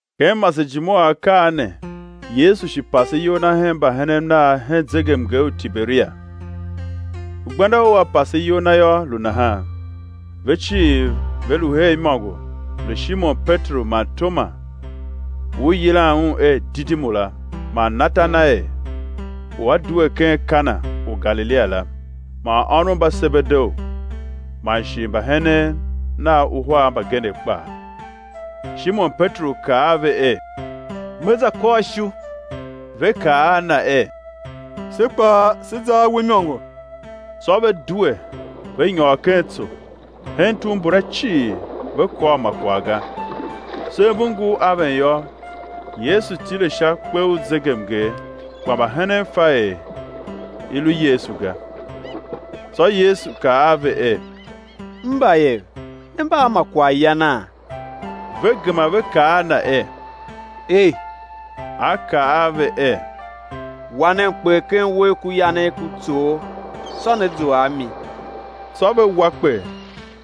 Ken masejime u akaa ne Yesu shi pase iyol Na hen mbahenen Nav hen zegemnger u Tiberia. Gbenda u A pase iyol Na yô, lu nahan: Ve cii ve lu her imôngo, lu Shimon Peteru man Toma, u i yilan un er Didimu la, man Natanael u a due ken Kana u Galilia la, man ônov mba Sebedeu, man shi mbahenen Nav uhar mbagenev kpaa. Shimon Peteru kaa a ve er: Me za kôr ishu. Ve kaa a na er: Se kpaa, sé za a we imôngo. Tsô ve due, ve nyôr ken tso; hen tugh mbula cii ve kôr ma kwagh ga. Sev mbu ngur aven yô, Yesu tile sha kpe u zegemnger; kpa mbahenen fa er i lu Yesu ga. Tsô Yesu kaa a ve er: Mbayev, ne mba a ma kwaghyana? Ve gema ve kaa a Na er: Ei. A kaa a ve er: Wa nen kper ken uwegh ku yanegh ku tsoogh, tsô né zua a mi. Tsô ve wa kper,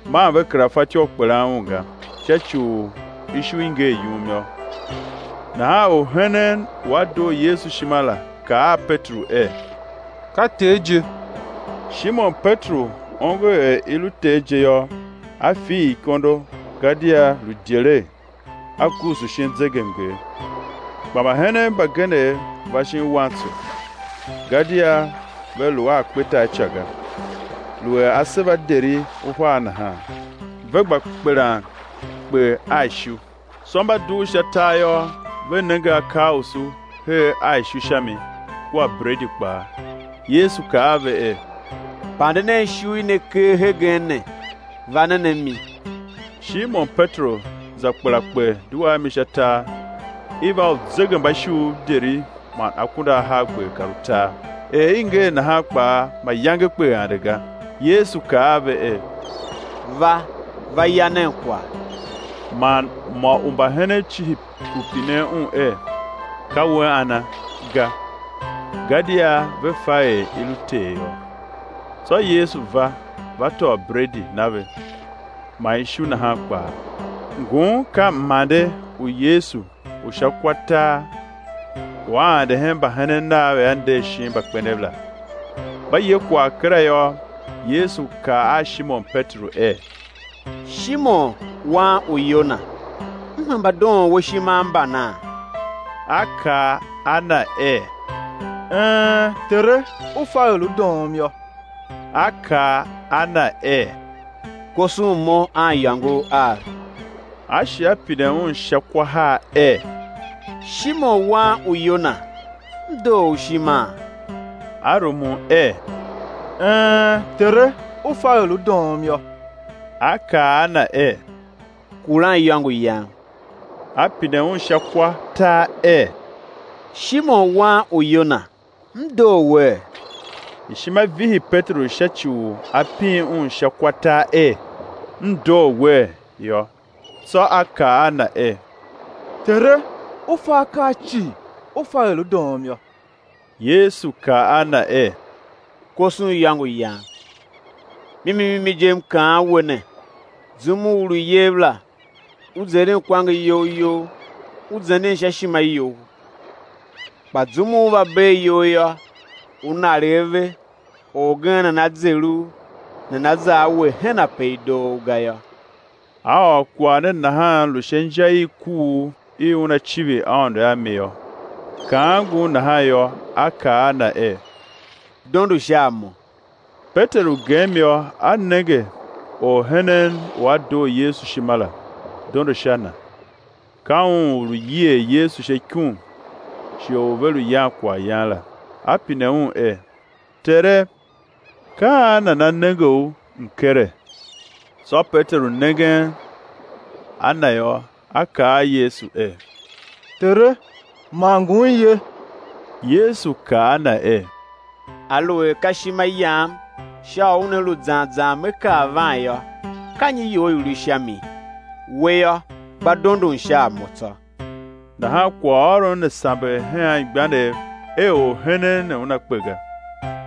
man ve kera fatyô u kpelan un ga, sha ci u ishu i ngee yum yô. Nahan orhenen u a doo Yesu Ishima la, kaa a Peteru er: Ka Ter je. Shimon Peteru ongo er i lu Ter je yô, a fiir ikondo, gadia lu idyelegh, a guusu shin zegemnger. Kpa mbahenen mbagenev va shin wantso, gadia ve lu a kpetar ica ga, lu er aseva deri uhar nahan, ve gba kpelan kper a ishu. Tsô mba dugh sha tar yô, ve nenge akausu her a ishu sha mi, kua bredi kpaa. Yesu kaa a ve er: Pande nen ishu i ne ker hegen ne, va nen a mi. Shimon Peteru za kpela kper, due a mi sha tar, iv a uzegembaishuuv deri man akunduahargber kar utar; er i ngee nahan kpaa mayange kper ande ga. Yesu kaa a ve er: Va, va ya nen kwagh. Man mô u mbahenen cihi u pinen Un er: Ka We ana? ga; gadia ve fa er i lu Ter yô. Tsô Yesu va, va tôô bredi, na ve, man ishu nahan kpaa. Ngun ka mande u Yesu u sha kwa tar u A ande hen mbahenen Nav er A nder shin mbakpenev la. Mba ye kwagh kera yô, Yesu kaa a Shimon Peteru er: Shimon, wan u Yona, M hemba doon we ishima a mbana? A kaa a Na er: Een, Tere, U fa er U doom yô. A kaa a na er: Koson Mo aniyôngov av. A shi A pine un sha kwa har er: Shimon wan u Yona, M doo u ishima? A rumun er: Een, Tere, U fa er U doom yô, A kaa a na er: Kuran iyôngo Yam. A pine un sha kwa tar er: Shimon, wan u Yona, M doo wee? Ishima vihi Peteru sha ci u a pin un sha kwa tar er: M doo wee, yô. Tsô a kaa a Na er: Tere, U fa akaa cii, U fa er U doom yô. Yesu kaa a Na er: Koson iyôngo Yam. Mimi mimi je, M kaan we ne, zum u u lu iyev la, u zeren kwange iyol you, u zenden sha ishima you; kpa zum u ú va bee iyol yô, ú naregh ave, orgen nana zer u, nana za a we hen ape i doo u ga yô. A ôr kwagh ne nahan lu sha inja i kuugh i una civir Aôndo a mi yô. Kaan ngun nahan yô, A kaa a na er: Dondo sha a Mo. Peteru gem yô, a nenge orhenen u a doo Yesu ishima la, dondo sha Na, ka un u lu yier Yesu sha ikum shighe u ve lu yan kwaghyan la, A pine Un er: Tere, ka an nana nenge U mkere? Tsô Peteru nengen a na yô, a kaa a Yesu er: Tere, man ngun ye? Yesu kaa a na er: Aluer ka ishima Yam sha u una lu zan zan Me kar van yô, ka nyi you i lu sha mi? We yô, gba dondon sha a Mo tsô. Nahan kwaghôron ne samber hen anmgbianev er orhenen ne una kpe ga.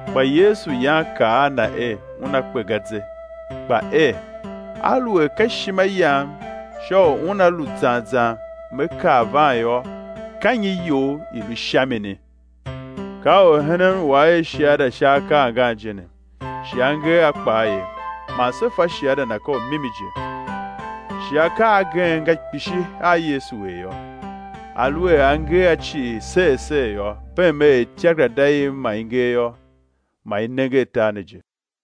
Kpa Yesu yan kaa a na er, una kpe ga ze, kpa er: Aluer ka ishima Yam sha u una lu zan zan Me kar van yô, ka nyi you i lu sha mini? Ka orhenen u a er shiada sha akaa angan je ne, shi a nger a kpaa ye; man se fa shiada na ka u mimi je. Shi akaa agen nga kpishi a Yesu er yô; aluer a nger a cii ser ser yô, beem er ityakerada i ma i nger yô, ma i nenger tar ne je.